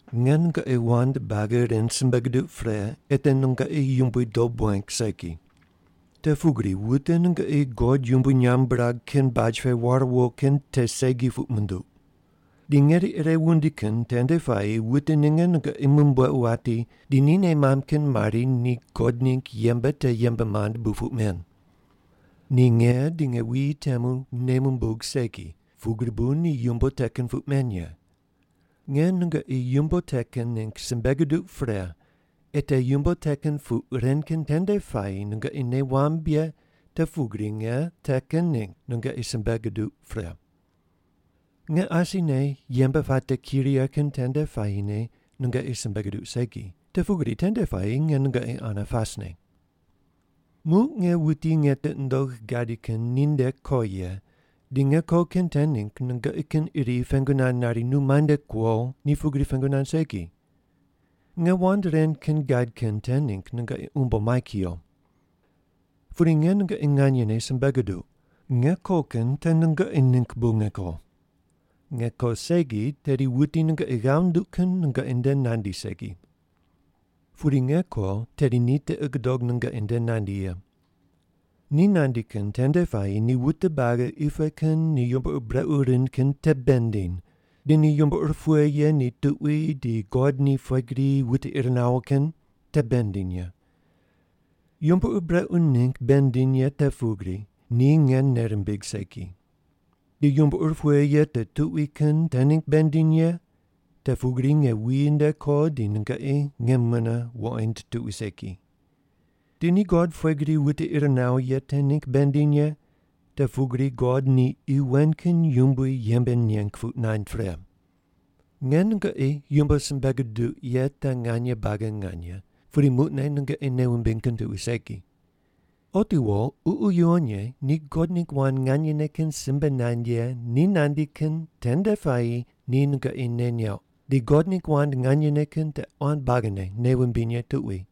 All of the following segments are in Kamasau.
“Nge nungoqi wand buagi ren simbe guduq pre ei te nungoqi Yumbui dob weng segi. Te pugri wute nungoqi God yumbui nyamb birag kin baj pe war wo kin te segi puq munduq. Di ngeri ire wundi kin tende puayi wute ninge nungoqi mumbuequ wati di ni nei mamb kin mari ni God ningg yembe te yembe mand bu puq men. Ni nge di nge wuyi temu nei mumbug segi, pugri bu ni yumbo te kin puq men ye. Nge nungoqi yumbo te kin ningg simbe guduq pre ei te yumbo te kin puq ren kin tende puayi nungoqi nei wamb ye te pugri nge te kin ningg nungoqi simbe guduq pre. Nge asine yembe puate ki righe kin tende puayine nungoqi simbe guduq segi, te pugri tende puayi nge nungoqi ane pasne. “Muq nge wuti nge tiqi nundogh gadi kin ninde ko ye, di nge ko kin te ningg nungoqi kin iri pengu nand nari, ‘Nu muainde kuo?’ ni pugri pengu nand segi. Nge wand ren kin gad kin te ningg nungoqi umbo mai kuyo. Pudi nge nungoqi nganyene simbe guduq: Nge ko kin te nungoqi ningg bu nge ko. Nge ko segi, tedi wuti nungoqi ghav nunduq kin nungoqi nde nandi segi. Pudi nge ko, tedi ni tiqi gudog nungoqi nde nandi ye. Ni nandi kin tende puayi ni wute buagi qi pe kin ni yumbo ur brequ rind kin te bei nindiny, di ni yumbo ur pughe ye ni tuqui di God ni pughe gri wute ir nawo kin te bei nindiny ye. Yumbo ur brequ ningg bei nindiny ye te pugri, ni nge nei rimbigh segi. Di yumbo ur pughe ye ni tuqui kin te ningg bei nindiny ye, te pugri nge wuyi nde ko di nungoqi nge mune wuqoind tuqui segi. Di ni God pughe gri wute ir nawo ye te ningg bei nindiny ye, te pugri God ni qi wen kin yumbui yembe neng puq nand pre. “Nge nungoqi yumbo simbe guduq ye te nganye buagi nganye, pudi muqne nungoqi nei wumbiny kin tuqui segi. Otiwo Ququ Yuwon Ye ni God ningg wand nganyene kin simbe nand ye ni nandi kin tende puayi ni nungoqi nei neuq, di God ningg wand nganyene kin te quan buagine nei wumbiny ye tuqui.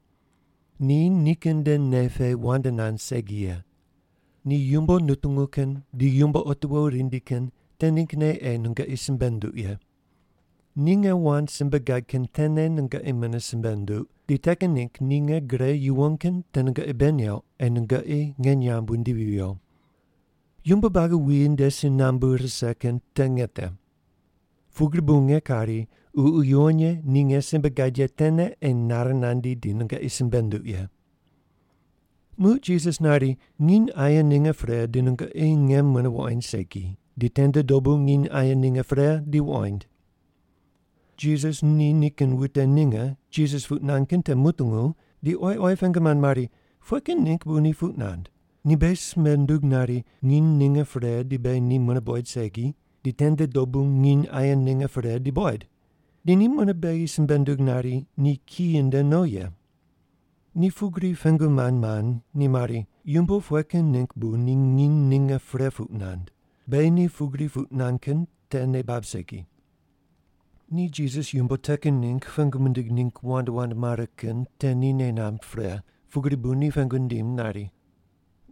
Ni nikin nde nei pe wand nand segi ye. Ni yumbo nutungu kin di yumbo otiwo rindi kin te ninggne ei nungoqi simbe nunduq ye. Ni nge wand simbe gad kin tene nungoqi mune simbe nunduq, di te kin ningg ni nge gre yuwon kin te nungoqi bei neuq ei nungoqi nge nyamb wundivi viyo. Yumbo buagi wuyi nde si nambu rise kin te nge te. Pugri bu nge kari, Ququ Yuwon Ye ni nge simbe gad ye tene ei nare nandi di nungoqi simbe nunduq ye.” Muq Jisas nari, “Nginy aye ninge pre di nungoqi nge mune wuqoind segi, di tende dobu nginy aye ninge pre di wuqoind.” Jisas ni nikin wute ninge Jisas puq nand kin te mutungu di oyi oyi pengu mand mari, “Pughe kin ningg bu ni puq nand? Ni beghi simbe ndug nari, nginy ninge pre di beghi ni mune buqoid segi, di tende dobu nginy aye ninge pre di buqoid. Di ni mune beghi simbe nundug nari ni kiyi nde no ye.” Ni pugri pengu mand mand, ni mari, “Yumbo pughe kin ningg bu ni ‘nginy ninge pre’ puq nand? Beghi ni pugri puq nand kin te nei bab segi.” Ni Jisas yumbo te kin ningg pengu mindig ningg wand wand mare kin te ni nei namb pre, pugri bu ni pengu nindim nari,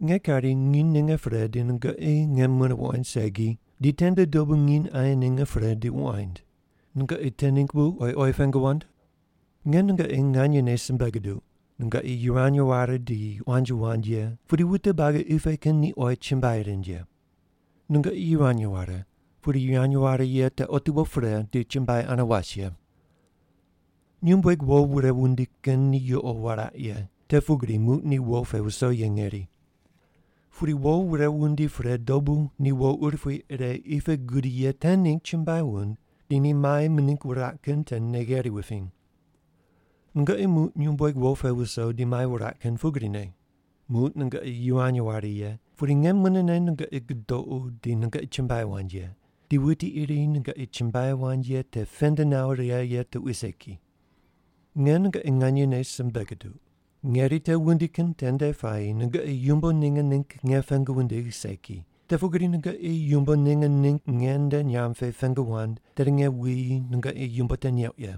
“Nge kari ‘nginy ninge pre di nungoqi nge mune wuqoind segi, di tende dobu nginy aye ninge pre di wuqoind.’ Nungoqi te ningg bu oyi oyi pengu wand? Nge nungoqi nganyene simbe guduq, nungoqi yivany ware di quanji wand ye, pudi wute buagi qi pe kin ni oyi chumbuai rind ye. Nungoqi yivany ware, pudi yivany ware ye te otiwo pre, di chumbuai ane was ye. Nyumbueg wo wure wundi kin ni yuqo wuraq ye, te pugri muq ni wo pe wuso ye ngeri. Pudi wo wure wundi pre dobu ni wo urupui ire qi pe gudi ye te ningg chumbuai wund, di ni mai mining wuraq kin te nei gheri wupiny. Nungoqi muq nyumbueg wo pe wuso di mai wuraq kin pugrine. Muq nungoqi yivany ware ye, pudi nge munene nungoqi gudoqu di nungoqi chumbuai wand ye, di wuti iri nungoqi chumbuai wand ye te pend nawo righe ye tuqui segi. Nge nungoqi nganyene simbe guduq. Ngeri te wundi kin tende puayi nungoqi yumbo ninge ningg nge pengu wundigh segi, te pugri nungoqi yumbo ninge ningg nge nde nyamb pe pengu wand, tedi nge wuyi nungoqi yumbo te neuq ye.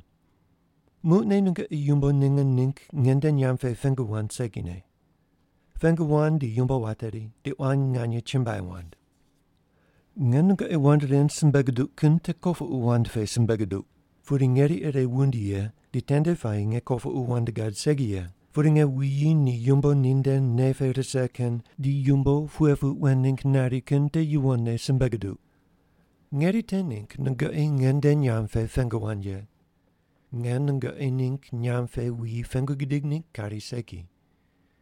Muqne nungoqi yumbo ninge ningg nge nde nyamb pe pengu wand segine. Pengu wand di yumbo wateri, di quan nganye chumbuai wand. “Nge nungoqi wand ren simbe guduq kin te kopuqu wand pe simbe guduq. Pudi ngeri ire wundi ye, di tende puayi nge kopuqu wand gad segi ye, pudi nge wuyi ni yumbo ninde nei pe rise kin di yumbo pughe puq wen ningg nari kin te yuwonne simbe guduq. Ngeri te ningg nungoqi ngende nyamb pe pengu wand ye. Nge nungoqi ningg nyamb pe wuyi pengu gidig ningg kari segi.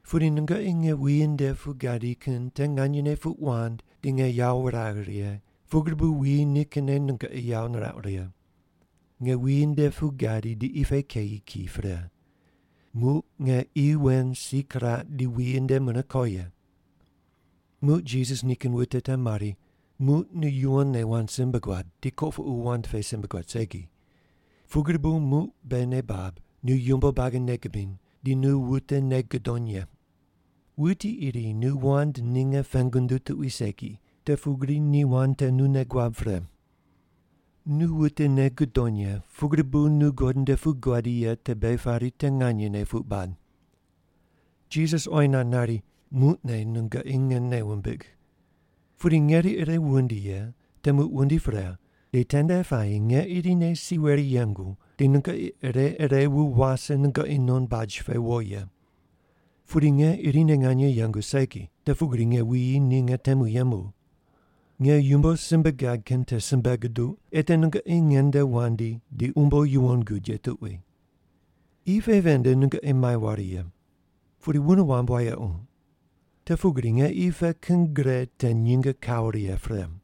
Pudi nungoqi nge wuyi nde pu gadi kin te nganyene puq wand di nge yawo wuragh righe, pugri bu wuyi nikinne nungoqi yawo nirauq righe. Nge wuyi nde pu gadi di qi pe keyi ki pre. Muq nge qi wen si kiraq di wuyi nde mune ko ye.” Muq Jisas nikin wute te mari, “Muq nu yuwonne wand simbe guad, di kopuqu wand pe simbe guad segi. Pugri bu muq beghi nei bab nu yumbo buagi nei gubiny, di nu wute nei gudony ye. Wuti iri nu wand ninge pengu nunduw tuqui segi, te pugri ni wand te nu nei guab pre. Nu wute nei gudony ye pugri bu nu God nde pu guadi ye te beghi pari te nganyene puq bad.” Jisas oyi nand nari, “Muqne nungoqi nge nei wumbigh. Pudi ngeri ire wundi ye, te muq wundi pre, di tende puayi nge irine si weri yengu, di nungoqi ire ire wu wase nungoqi non baj pe wo ye. Pudi nge irine nganye yengu segi, te pugri nge wuyi ni nge temu yembu. Nge yumbo simbe gad kin te simbe guduq, ei te nungoqi ngende wandi di umbo yuwon gud ye tuqui. Qi pe ven nde nungoqi mai ware ye. Pudi wune wamb wayequ. Te pugri nge qi pe kin gre te nyinge kawo righe pre.”